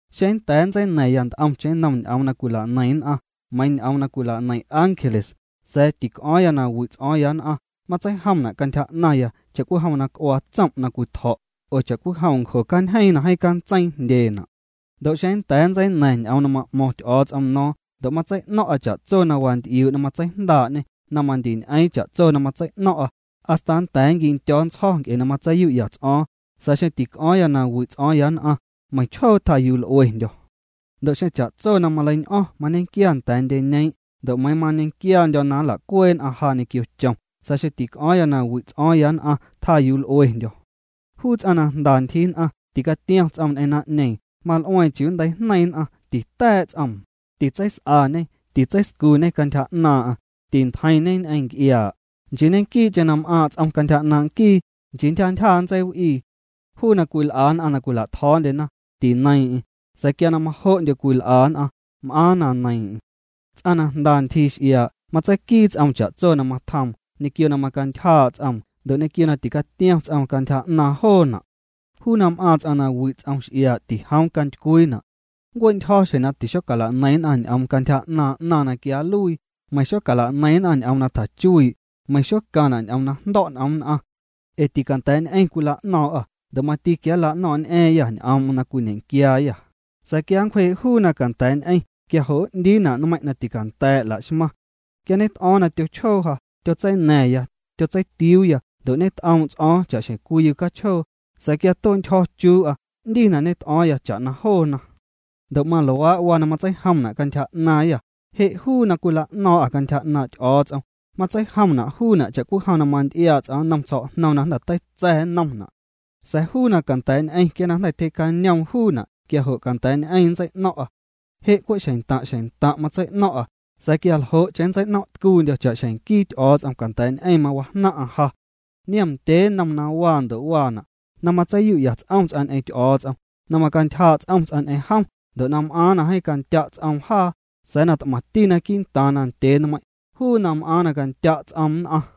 Xeⁿ nnda̱a̱ nntseina̱ⁿya nt'omcheⁿ nnom ñ'oom na cwila'neiⁿ nn'aⁿ, meiiⁿ ñ'oom na cwila'neiⁿ ángeles, sa̱a̱ tic'o̱o̱ⁿ na wi' ts'o̱o̱ⁿya nn'aⁿ, matseijomna' cantyja 'naⁿya cha'cwijom na c'uaa tsom' na cwitjo̱' oo cha'cwijom ncjo cañjeeⁿ na cantseiiⁿ jndyeena'. Ndo' xeⁿ nnda̱a̱ nntseina̱ⁿ ñ'oom na ma'mo̱ⁿ Ty'o̱o̱ts'om no̱o̱ⁿ ndo' matsei'no̱ⁿ'a cha'tso na wanty'iuu' na matseijndaa'ñê na mandiñ'eeⁿ cha'tso na matsei'no̱ⁿ'a, hasta nnda̱a̱ nquindyo̱o̱ ntsjo̱ nc'e na matseiyu'ya ts'o̱o̱ⁿ, sa̱a̱ xeⁿ tic'o̱o̱ⁿya nawi' ts'o̱o̱ⁿya nn'aⁿ, meiⁿchjoo tjayuu l'uendyo̱. Ndo' xeⁿ cha'tso na maleiñ'o̱ⁿ mañequia nda̱a̱ ndyeñeeⁿ' ndo' meiiⁿ mañequiandyo̱ na nla'cuee' nn'aⁿ ja ñequio chom, sa̱a̱ xeⁿ tic'o̱o̱ⁿ na wi' ts'o̱o̱ⁿ nn'aⁿ, tjaa yuu l'uendyo̱. Juu ts'aⁿ na jnda ntyjii nn'aⁿ, ticatiom ts'om ñ'eⁿ naⁿ'ñeeⁿ, mal'ueeⁿ chiuu nnteijneiⁿ nn'aⁿ, tita̱a̱' ts'oom, titseis'añê titseiscuñê cantyja 'naaⁿ'aⁿ, tintjeiⁿñe ñ'eⁿ nc'iaa', nchii ñequii'cheⁿ na m'aaⁿ' ts'om cantyja 'naaⁿ' nquii, nchii ntyja ntyja matseiw'ii. Juu na cwil'a nn'aⁿ na cwila'tjo̱o̱ndyena, tineiiⁿ'eⁿ, sa̱a̱ quia na majo'ndyo cwil'a nn'aⁿ, m'aaⁿ na neiiⁿ'eⁿ. Ts'aⁿ na jnda ntyjii x'iaa' matseiquii ts'oom cha'tso na matjoom, ñequio na macantyjaa' ts'oom ndo' ñequio na ticatiom ts'oom cantyja 'naaⁿ joona'. Juu na m'aaⁿ ts'aⁿ na wi' ts'om x'iaa' tijoom cantycwiina'. Nncue'ntyjo̱ xjeⁿ na tixocala'neiⁿ nn'aⁿ ñ'oom cantyja 'naaⁿ 'naⁿ na quia nluii, meiⁿ xocala'neiⁿna ñ'oom na tjachuii', meiⁿ xocaⁿna' ñ'oom na jndo̱' n'om nn'aⁿ. Ee ticanda̱a̱'ñ'eⁿ cwila'no̱o̱ⁿ'â ndo' mati quia nla'no̱o̱ⁿñ'a̱a̱yâ ñ'oom'm na cwiñequiaayâ, sa̱a̱ quia nncwjee' juu na canda̱a̱'ñ'eⁿ quia jo' n'ndiina' nmeiⁿ' na ticanda̱a̱' la'xmaⁿ. Quia ñet'o̱o̱ⁿ na tyochjoo ja, tyotseina̱ⁿya, tyotseitiuuya ndo' ñet'oom' ts'o̱o̱ⁿ cha'xjeⁿ cwii yucachjoo, sa̱a̱ quia na tue'ntyjo̱ chuu'a 'ndi na ñet'o̱o̱ⁿya cha'na joona. Ndo' maluaa' waa na matseijomna' cantyja 'naaⁿyâ, je' juu na cwila'no̱o̱ⁿ'â cantyja 'naaⁿ' Ty'o̱o̱ts'om, matseijomna' juuna' cha'cwijom na manty'iaa' ts'aⁿ nnon tsjo̱'jñom na jnda̱ teitsa̱ nnomna'. Sa̱a̱ juu na canda̱a̱'ñ'eⁿ quia na jnda̱ tyjee'cañoom juuna' quia jo' canda̱a̱'ñ'eⁿ nntsei'no̱ⁿ'a. Je' cwe' xeⁿntaⁿ' xeⁿntaⁿ' matsei'no̱ⁿ'a sa̱a̱ quia ljo'cheⁿ nntsei'no̱ⁿ'tcuundyo̱ cha'xjeⁿ nquii Ty'o̱o̱ts'om canda̱a̱'ñ'eⁿ mawajnaⁿ'aⁿ ja. Niom ndyee nnom na waa ndo' waana': na matseiyu'ya ts'om ts'aⁿ ñ'eⁿ Ty'o̱o̱ts'om, na macantyjaa' ts'om ts'aⁿ ñ'eⁿ jom ndo' na m'aaⁿ na jeeⁿ candya' ts'oom jaa, sa̱a̱ t'maⁿti naquii' ntaaⁿ ndyee nmeiiⁿ', juu na m'aaⁿ na candya' ts'oom nn'aⁿ.